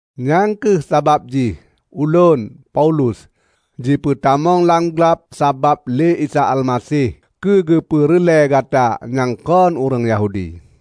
Nyang kheueh sabab jih ulôn, Paulus, jipeutamong lam glab sabab lé Isa Almaseh keu keupeureulée gata nyang kon ureuëng Yahudi.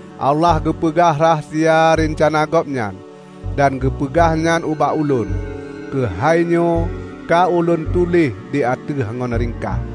Allah geupeugah rahsia reuncana Gobnyan dan geupeugah nyan ubak ulôn. (Keuhainyoe ka ulôn tuléh di ateueh ngon ringkaih,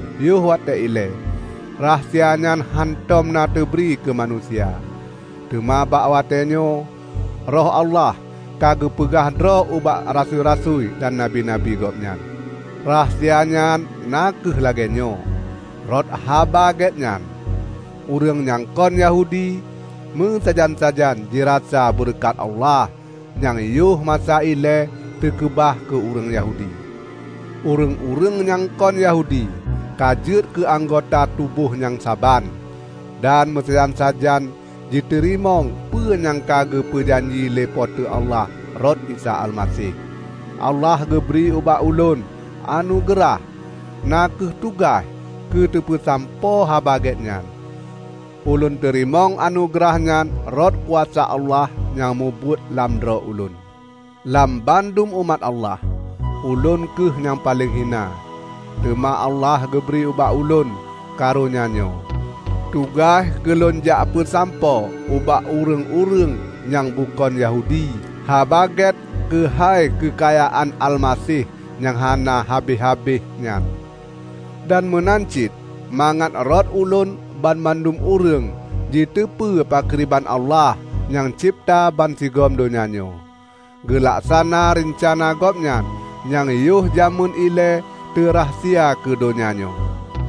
Yoh watée ilée rahsia nyan hántom na teubri keumanusia, teuma bak watée nyoe Roh Allah ka geupeugah droe ubak rasui-rasui dan nabi-nabi Gobnyan. Rahasia nyan na kheueh lagée nyoe: Rot Haba Gét nyan, ureuëng nyang kon Yahudi meusajan-sajan jirasa beureukat Allah nyang yoh masa ilée teukeubah keu ureuëng Yahudi. Ureuëng-ureuëng nyang kon Yahudi ka jeuet keu anggota tuboh nyang saban, dan meusajan-sajan jiteurimong peue nyang geupeu janji lé Po teu Allah rot Isa Almaseh. Allah geubri ubak ulôn anugeurah -- na kheueh tugaih -- keuteupeusampoe Haba Gét nyan. Ulôn teurimong anugeurah nyan rot kuasa Allah nyang mubuet lam droe ulôn. Lam bandum umat Allah, ulôn kheueh nyang paleng hina. Teuma Allah geubri ubak ulôn karonya nyoe: tugaih keulôn jak peusampoe ubak ureuëng-ureuëng nyang bukon Yahudi Haba Gét keuhai keukayaan Almaseh nyang hana habéh-habéh nyan; dan meunan cit mangat rot ulôn banmandum ureuëng jiteupeue pakriban Allah, nyang cebta bansigom donya nyoe, geulaksana reuncana Gobnyan nyang yoh jamén ilée teurahsia keu donya nyoe.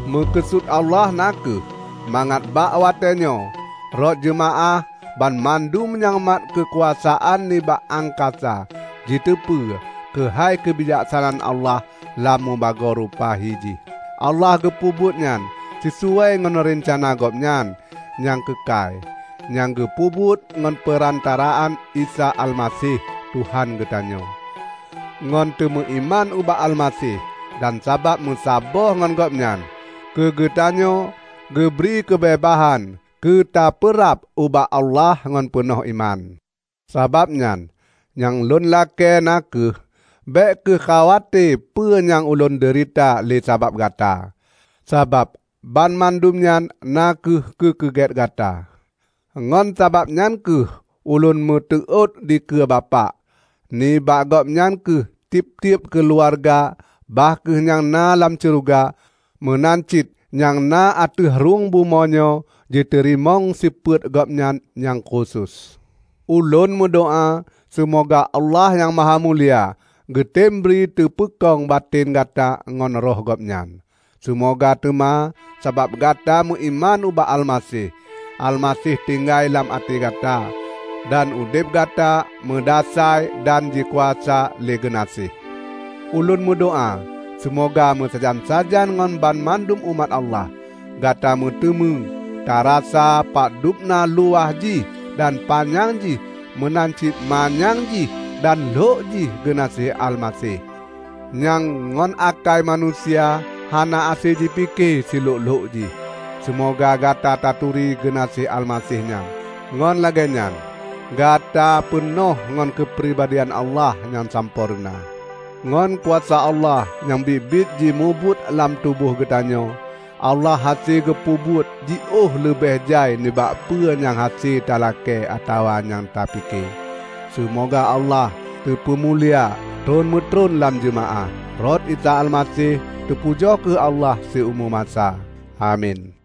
Meukeusut Allah na kheueh mangat bak watée nyoe, rot jeumaáh, banmandum nyang mat keukuasaan nibak angkasa jiteupeue keuhai keubijaksanaan Allah lam mubagoe rupa hi jih. Allah geupeubuet nyan sisuai ngon reuncana Gobnyan nyang keukai, nyang geupeubuet ngon peurantaraan Isa Almaseh Tuhan geutanyoe. Ngon teumeuiman ubak Almaseh dan sabab meusaboh ngon Gobnyan, keugeutanyoe geubri keubeubaihan keu tapeurab ubak Allah ngon peunoh iman. Sabab nyan, nyang lôn lakée na kheueh: bék kheueh khawate peue nyang ulôn deurita lé sabab gata, sabab banmandum nyan na kheueh keu keugét gata. Ngon sabab nyan kheueh ulôn meuteuôt dikeue Bapak. Nibak Gobnyan kheueh tieb-tieb keuluwarga bah kheueh nyang na lam syeuruga meunan cit nyang na ateueh rhueng bumoe nyoe jiteurimong sifeuet Gobnyan nyang khusos. Ulôn meudoá seumoga Allah nyang mahamulia geutembri teupeukong batén gata ngon Roh Gobnyan. Seumoga teuma sabab gata meuiman ubak Almaseh, Almaseh tinggai lam até gata, dan udeb gata meudasai dan jikuasa lé geunaséh. Ulôn meudoá seumoga meusajan-sajan ngon banmandum umat Allah, gata meuteumé tarasa padubna luwah jih dan panyang jih meunan cit manyang jih dan lhok jih geunaséh Almaseh, nyang ngon akai manusia hana hase jipike silhok-lhok jih. Seumoga gata taturi geunaséh Almaseh nyan, ngon lagée nyan gata peunoh ngon keupribadian Allah nyang sampoereuna. Ngon kuasa Allah nyang biet-biet jimubuet lam tuboh geutanyoe, Allah hase geupeubuet jiôh leubeh jai nibak peue nyang hase talakée atawa nyang ta pike. Seumoga Allah teupeumulia tron meutron lam jeumaáh, rot Isa Almaseh. Teupujoe kheueh Allah siumu masa! Amin.